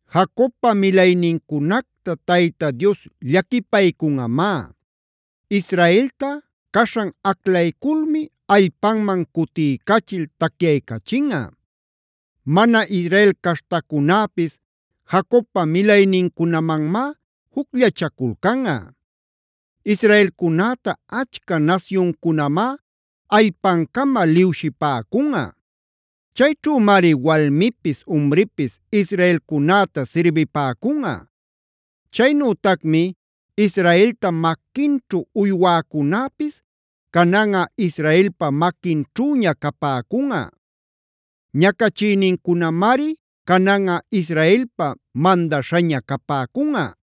Jacobpa milaynincunacta Tayta Dios llaquipaycunꞌamá. Israelta caśhan aclayculmi allpanman cutiycachil tacyaycachinꞌa. Mana Israel caśhtacunäpis Jacobpa milaynincunamanmá jucllachaculcanꞌa. Israelcunäta achca nasyuncunamá allpancama liwshipäcunꞌa. Chayćhümari walmipis umripis israelcunäta sirbipäcunꞌa. Chaynütacmi Israelta maquinćhu uywäcunäpis cananꞌa Israelpa maquinćhüña capäcunꞌa; ñacachïnincunamari cananꞌa Israelpa mandaśhaña capäcunꞌa.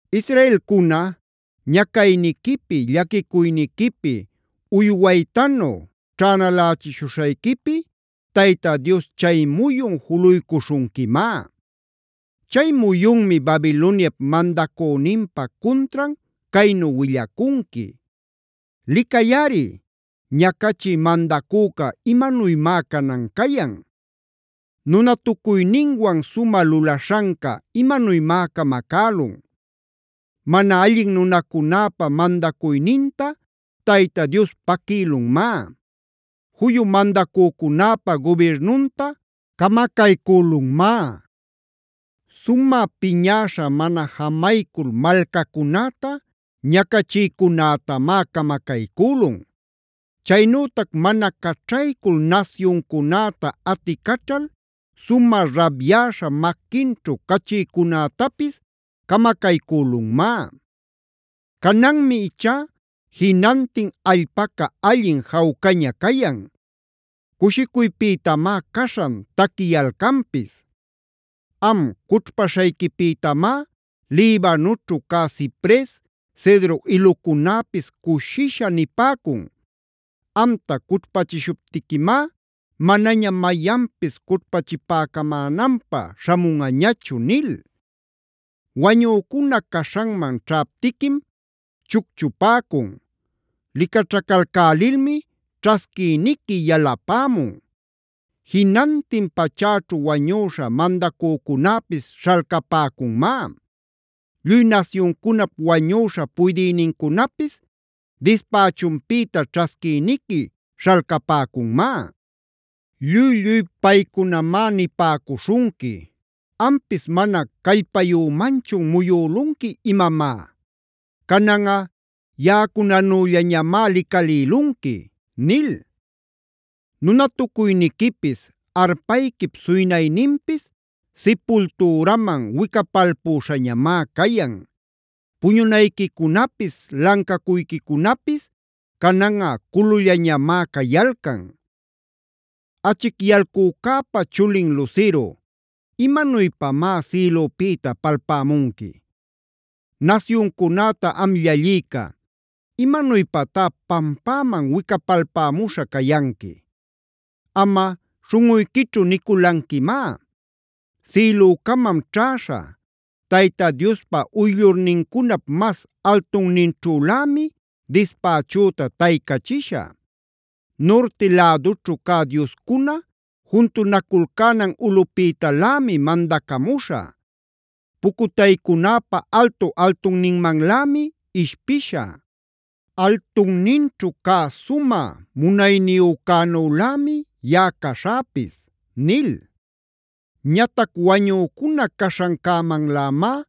Israelcuna, ñacayniquipi, llaquicuyniquipi, uywaytanu ćhänalächishuśhayquipi Tayta Dios chay muyun juluycuśhunquimá. Chay muyunmi Babiloniap mandacüninpa cuntran caynu willacunqui: “¡Licayꞌari, ñacachï mandacüca imanuymá canan cayan! ¡Nunatucuyninwan sumä lulaśhanca imanuymá camacälun! Mana allin nunacunäpa mandacuyninta Tayta Dios paquïlunmá; juyu mandacücunäpa gubirnunta camacaycülunmá. Sumä piñäśha mana jamaycul malcacunäta ñacachïcunätamá camacaycülun. Chaynütac mana caćhaycul nasyuncunäta aticaćhal sumä rabyäśha maquinćhu cachïcunätapis camacaycülunmá. Cananmi ichá jinantin allpaca allin jawcaña cayan; cushicuypïtamá caśhan taquiyalcanpis. Am cućhpaśhayquipïtamá Libanoćhu cä cipres, cedro ilucunäpis cushisha nipäcun: ‘Amta cućhpächishuptiquimá, manaña mayanpis cućhpachipäcamänanpä śhamunꞌañachu’ nil. “Wañücuna caśhanman ćhaptiquim chucchupäcun. Licaćhacalcälilmi ćhasquïniqui yalapämun. Jinantin pachäćhu wañüśha mandacücunäpis śhalcapäcunmá; lluy nasyuncunap wañüśha puydïnincunapis dispächunpïta ćhasquïniqui śhalcapäcunmá. Lluy-lluy paycunamá nipäcuśhunqui: ‘¿Ampis mana callpayümanchun muyülunqui imamá? Cananꞌa yaꞌacunanüllañamá licalïlunqui’ nil. Nunatucuyniquipis, arpayquip suynayninpis sipultüraman wicapalpüśhañamá cayan. Puñunayquicunapis, lancacuyquicunapis cananꞌa culullañamá cayalcan. “Achicyalcücäpa chulin lusiru, ¿imanuypamá sïlüpïta palpämunqui?a Nasyuncunäta am llallïca, ¿¡imanuypatá pampäman wicapalpämuśha cayanqui!? Amꞌa śhunꞌuyquićhu niculanquimá: ‘Sïlucamam ćhäśha; Tayta Diospa uyllurnincunap mas altunninćhülämi dispächüta taycachishä. Nurti lädućhu cä dioscunab juntunaculcänan ulꞌupïtalämi mandacamuśhä. Pucutaycunäpa altu-altunninmanlämi ishpishä. Altunninćhu cä Sumä Munayniyücänülämi yaꞌa caśhäpis’ nil. Ñatac wañücuna caśhancämanlämá,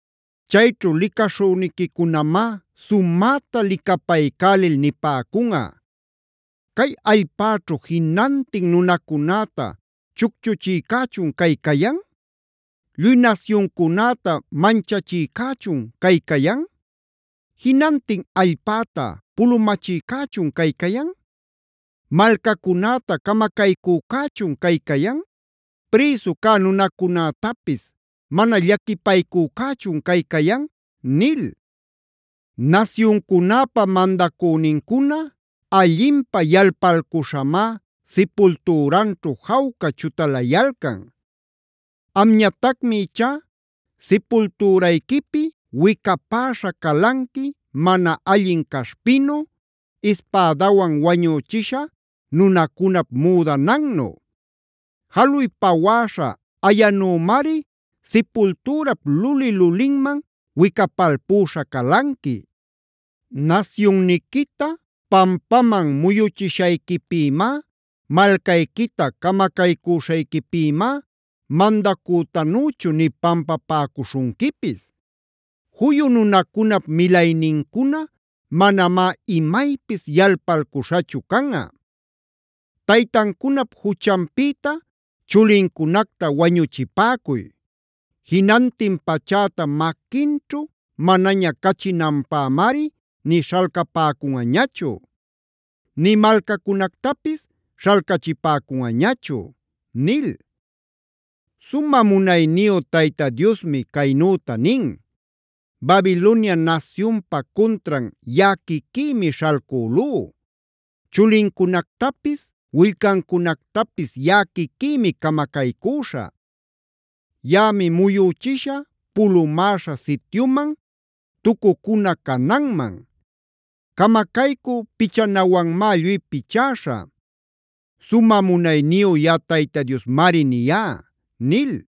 Chayćhu licaśhüniquicunamá sumäta licapaycälil nipäcunꞌa: ‘¿Cay allpäćhu jinantin nunacunäta chucchuchïcächun cay cayan? ¿Lluy nasyuncunäta manchachïcächun cay cayan? ¿Jinantin allpäta pulumachïcächun cay cayan? ¿Malcacunäta camacaycücächun cay cayan? ¿Prïsu cä nunacunätapis mana llaquipaycücächun cay cayan?’ nil. “Nasyuncunäpa mandacünincuna allinpä yalpalcuśhamá sipultüranćhu jawca chutalayalcan. Amñatacmi ichá sipultürayquipi wicapäśha calanqui mana allin caśhpinu, ispädawan wañüchisha nunacunap müdanannu; jaluy pawäśha ayanümari sipultürap luli-lulinman wicapalpüśha calanqui. Nasyunniquita pampaman muyuchishayquipïmá, malcayquita camacaycüśhayquipïmá mandacütanüchu nï pampapäcuśhunquipis. Juyu nunacunap milaynincuna manamá imaypis yalpalcuśhachu canꞌa. Taytancunap juchanpïta chulincunacta wañuchipäcuy. Jinantin pachäta maquinćhu manaña cachinanpämari nï śhalcapäcunꞌañachu, nï malcacunactapis śhalcachipäcunꞌañachu” nil. Sumä munayniyu Tayta Diosmi caynüta nin: “Babilonia nasyunpa cuntran yaꞌa quiquïmi śhalcülú; chulincunactapis, willcancunactapis yaꞌa quiquïmi camacaycüśhä. Yaꞌami muyüchishä pulumäśha sityuman, tucucuna cananman. Camacaycü pichanawanmá lluy pichäśhä. Sumä munayniyu yaꞌa Tayta Diosmari niyá” nil.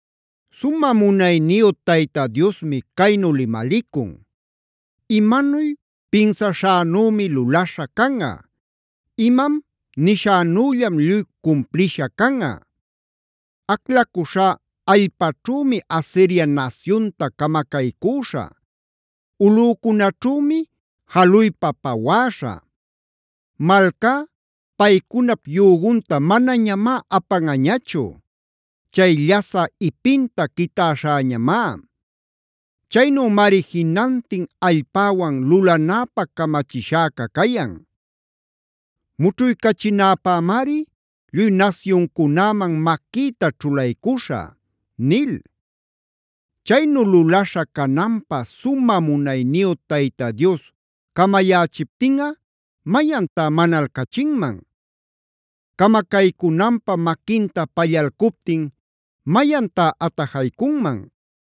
Sumä munayniyu Tayta Diosmi caynu limalicun: “Imanuy pinsaśhänümi lulaśha canꞌa. Imam nishänüllam lluy cumplisha canꞌa. Aclacuśhá allpaćhümi Asiria nasyunta camacaycüśhä;d ulꞌücunäćhümi jaluypa pawäśhä. Malcá paycunap yügunta manañamá apanꞌañachu; chay llasä ipinta quitäśhäñamá. Chaynümari jinantin allpäwan lulanäpä camachishäca cayan; mućhuycachinäpämari lluy nasyuncunäman maquïta ćhulaycuśhä” nil. Chaynu lulaśha cananpä sumä munayniyu Tayta Dioscamayächiptinꞌa, ¿mayantá manalcachinman? Camacaycunanpä maquinta pallalcuptin, ¿mayantá atajaycunman?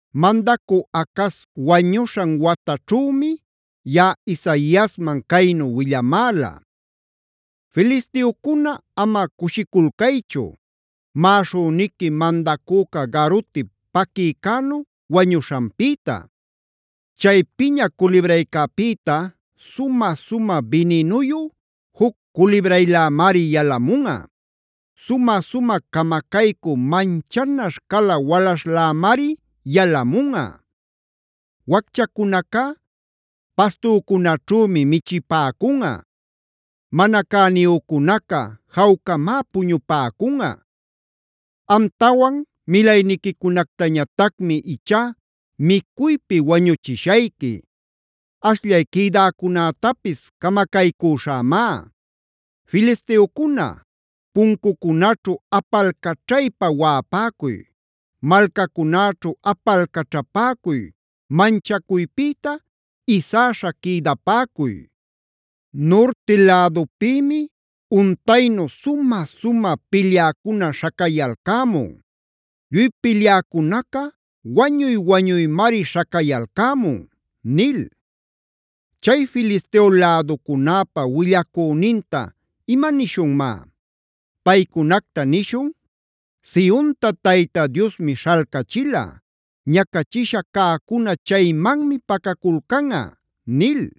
Mandacü Acaze wañuśhan wataćhümi yaꞌa Isaiasman caynu willamäla: “Filisteocuna ama cushiculcaychuf maꞌaśhüniqui mandacüca garuti paquïcänu wañuśhanpïta. Chay piña culibraycäpïta sumä-sumä bininuyu juc culibraylämari yalamunꞌa; sumä-sumä camacaycü manchanaśh cala walaśhlämari yalamunꞌa. Wacchacunacá pastücunaćhümi michipäcunꞌa; mana cäniyücunaca jawcamá puñupäcunꞌa. Amtawan milayniquicunactañatacmi ichá micuypi wañuchishayqui; ashllay quïdäcunätapis camacaycüśhämá. Filisteocuna, puncucunaćhu apalcaćhaypa waꞌapäcuy, malcacunäćhu apalcaćhapäcuy, manchacuypïta isäśha quïdapäcuy. Nurti lädupïmi untaynu sumä-sumä pilyäcuna śhacayalcämun; lluy pilyäcunaca wañuy-wañuymari śhacayalcämun” nil. Chay Filisteo läducunäpa willacüninta ¿imanishunmá? Paycunacta nishun: “Sionta Tayta Diosmi śhalcachila; ñacachisha cäcuna chaymanmi pacaculcanꞌa” nil.